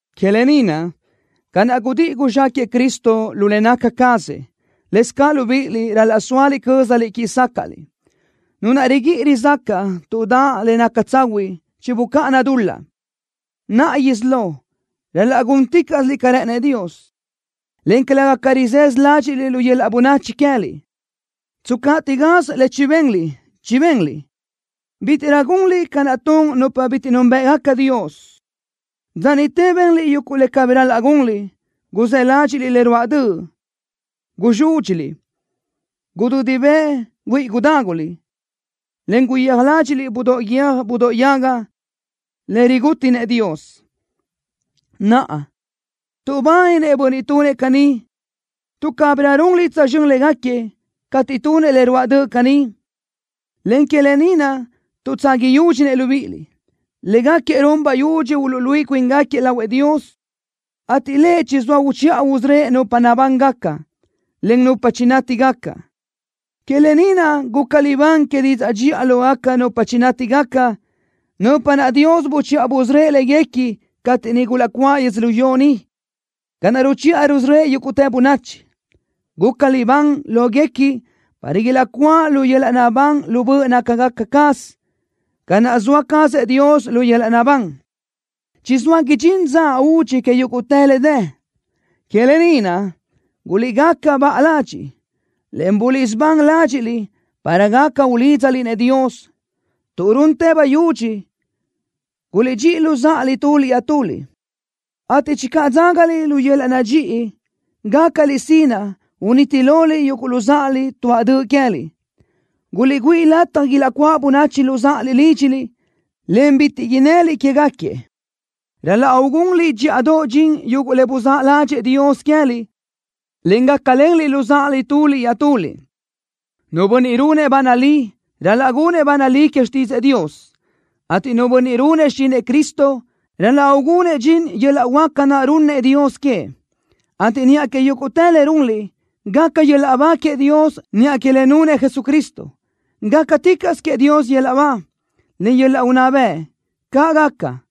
Que lë ni naʼ, ca naʼ gudíʼi guzxáquëʼë Cristo lu le naca cazëʼ, lëscaʼ libíʼiliʼ ral-laʼ soa cö́zaliʼ quíʼi sácaʼliʼ. Nu naʼ riguíʼi rizácaʼa tuʼ daʼ le naca tsahuiʼ chibucáʼana dul-laʼ. Naʼa isí lo, ral-laʼ gúnticaʼsiliʼ ca rë́ʼënëʼ Dios, en calëga ca rizësö ládxiʼliʼ lu yöl-laʼ bönachi queë́liʼ. Tscaʼtiʼ gaz le chibenliʼ chibenliʼ. Bítiʼrö gunliʼ ca naʼ tun nupa bitiʼ núnbëʼgaca Dios. Dza niʼte benliʼ yuguʼ le cabí ral-laʼ gunliʼ. Guzë́ ládxiʼliʼ le ruáʼ döʼ. Guzúdxiliʼ. Gudödi bëʼ güíʼi gudáguliʼ, en guyéaj ládxiʼliʼ budóʼ guiö́j budóʼ yaga, le rigútinëʼ Dios. Naʼa, tuʼbáninëʼ bönniʼ tunëʼ caní tuʼ cabirö runliʼ tsözxö́n légaquiëʼ cateʼ tunëʼ le ruáʼ döʼ caní, en que lë ni naʼ tuʼtsaga yúdxinëʼ libíʼiliʼ. Légaquiëʼ run bayudxi uluʼluíʼi cuíngaquiëʼ lahuëʼ Dios, ateʼ Lëʼ chizóa uchiʼa usörö́ëʼ nupa nabángaca, en nupa chinátigaca. Que lë ni naʼ guca libán que didzaʼ dxiʼa lógaca nupa chinátigaca, nupa naʼ Dios buchiʼa busörö́ëʼ léguequi cateʼ niʼ gulaʼcuáʼ yödzölió ni, ca naʼ ruchiʼa rusörö́ëʼ yúguʼtë bönachi. Guca libán lóguequi para ilaʼcuáʼ lu yöl-laʼ naʼbán lu böʼ nácagaca caz, ca naʼ zoa cazëʼ Dios lu yöl-laʼ naʼbán. Chizóa idxín dza údxi que yúguʼtë le dë. Que lë ni naʼ, guliʼgaca baʼa ladxiʼ, en buliʼsubán ládxiʼliʼ para gaca ulídzaliʼ-nëʼ Dios. Tuʼ runtë bayudxi, guliʼdxíʼi luzáʼaliʼ tuliʼ iaʼtuliʼ, ateʼ channö dzágaliʼ lu yöl-laʼ nadxíʼi, gácaliʼ sinaʼ uniti loliʼ yuguʼ luzáʼaliʼ tuaʼ döʼ queë́liʼ. Guliʼgüíʼ lataj ilaʼcuáʼ böchiʼ luzáʼaliʼ lídxiliʼ, en bitiʼ innëliʼ quégaquiëʼ. Ral-laʼ ugunliʼ dxíʼadoʼ dxin yuguʼ le buzáʼ ládxëʼë Dios queë́liʼ, en gácalenliʼ luzáʼaliʼ tuliʼ iaʼtuliʼ. Nu bönniʼ runëʼ ba nalí, ral-laʼ gunëʼ ba nalí que xtídzëʼë Dios, ateʼ nu bönniʼ runëʼ xichinëʼ Cristo, ral-laʼ ugunëʼ dxin yöl-laʼ huáca naʼ runnëʼ Dios queëʼ, ateʼ niʼa que yúguʼtë le runliʼ, gaca yöl-laʼ ba queëʼ Dios niʼa que le nunëʼ Jesucristo. ¡Gácaticaʼsö queëʼ Dios yöl-laʼ ba, en yöl-laʼ unná bëʼ! ¡Caʼ gaca!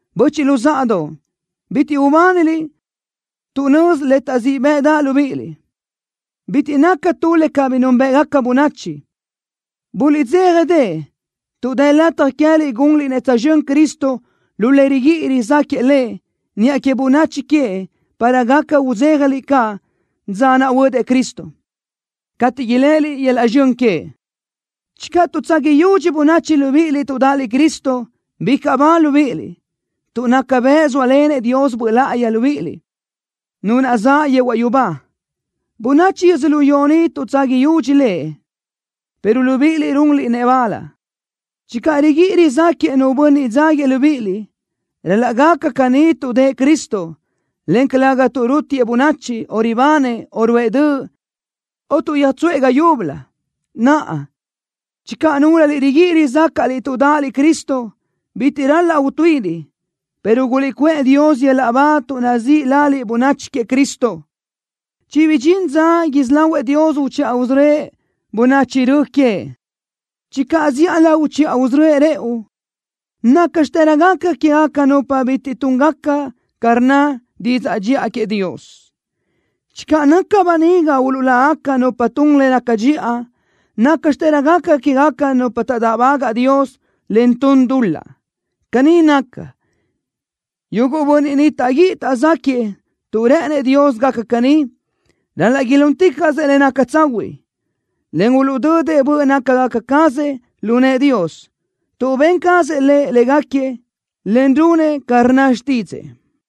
Böchiʼ luzáʼadoʼ, bitiʼ ubániliʼ tuʼ nözi le taʼzíʼ bëʼdaʼ libíʼiliʼ. Bitiʼ naca tu le cabí núnbëʼgaca bönachi. Guliʼdzéjadeʼe tuʼ dë lataj queë́liʼ gunliʼ-nëʼ tsözxö́n Cristo lu le riguíʼi rizáquëʼë Lëʼ niʼa que bönachi queëʼ para gaca udzéjaliʼ caʼ dza naʼ huödëʼ Cristo, cateʼ iléʼeliʼ yöl-laʼ zxön queëʼ. Channö tuʼdzaga yudxi bönachi libíʼiliʼ tuʼ dáʼaliʼ Cristo, bicaʼ ba libíʼiliʼ, tuʼ naca bëʼ zóalenëʼ Dios Böʼ Láʼayi libíʼiliʼ, Nu naʼ zaʼ yehuaʼ yubá. Bönachi yödzölió ni tuʼdzaga yudxi Lëʼ, pero libíʼiliʼ runliʼ-nëʼ bal. Channö riguíʼi rizáquëʼë nu bönniʼ dzáguiëʼ libíʼiliʼ, ral-laʼ gaca caní tuʼ dëʼë Cristo, en calëga tuʼ rútiëʼ bönachi, o ribanëʼ, o ruʼë döʼ, o tuʼ yöjgútsëʼë ga yúbölö. Naʼa, channö núlöliʼ riguíʼi rizácaʼliʼ tuʼ dáʼaliʼ Cristo, bitiʼ ral-laʼ utuíʼiliʼ, pero guliʼcuʼë Dios yöl-laʼ ba tuʼ nazíʼ laliʼ bönachi queëʼ Cristo. Chibidxín dza isí lahuëʼ Dios uchiʼa usörö́ëʼ bönachi rö queëʼ. Channö zíʼalö uchiʼa usörö́ëʼ rëʼu, ¿nácxitërö gaca quégaca nupa bitiʼ túngaca ca rnna didzaʼ dxiʼa queëʼ Dios? Channö naca böniga uluʼlágaca nupa tun le naca dxiʼa, ¿nácxitërö gaca quégaca nupa taʼdáʼbagaʼ Dios, en tun dul-laʼ? Caní naca, yuguʼ bönniʼ ni taʼguíʼi taʼzaquëʼë tuʼ rë́ʼënëʼ Dios gaca caní, ral-laʼ ilúnticaʼsëʼ le naca tsahuiʼ, en uluʼdödëʼ böʼ nácagaca cazëʼ lu nëʼë Dios, tuʼ ben cazëʼ Lëʼ légaquiëʼ, en runëʼ ca rnna xtídzëʼë.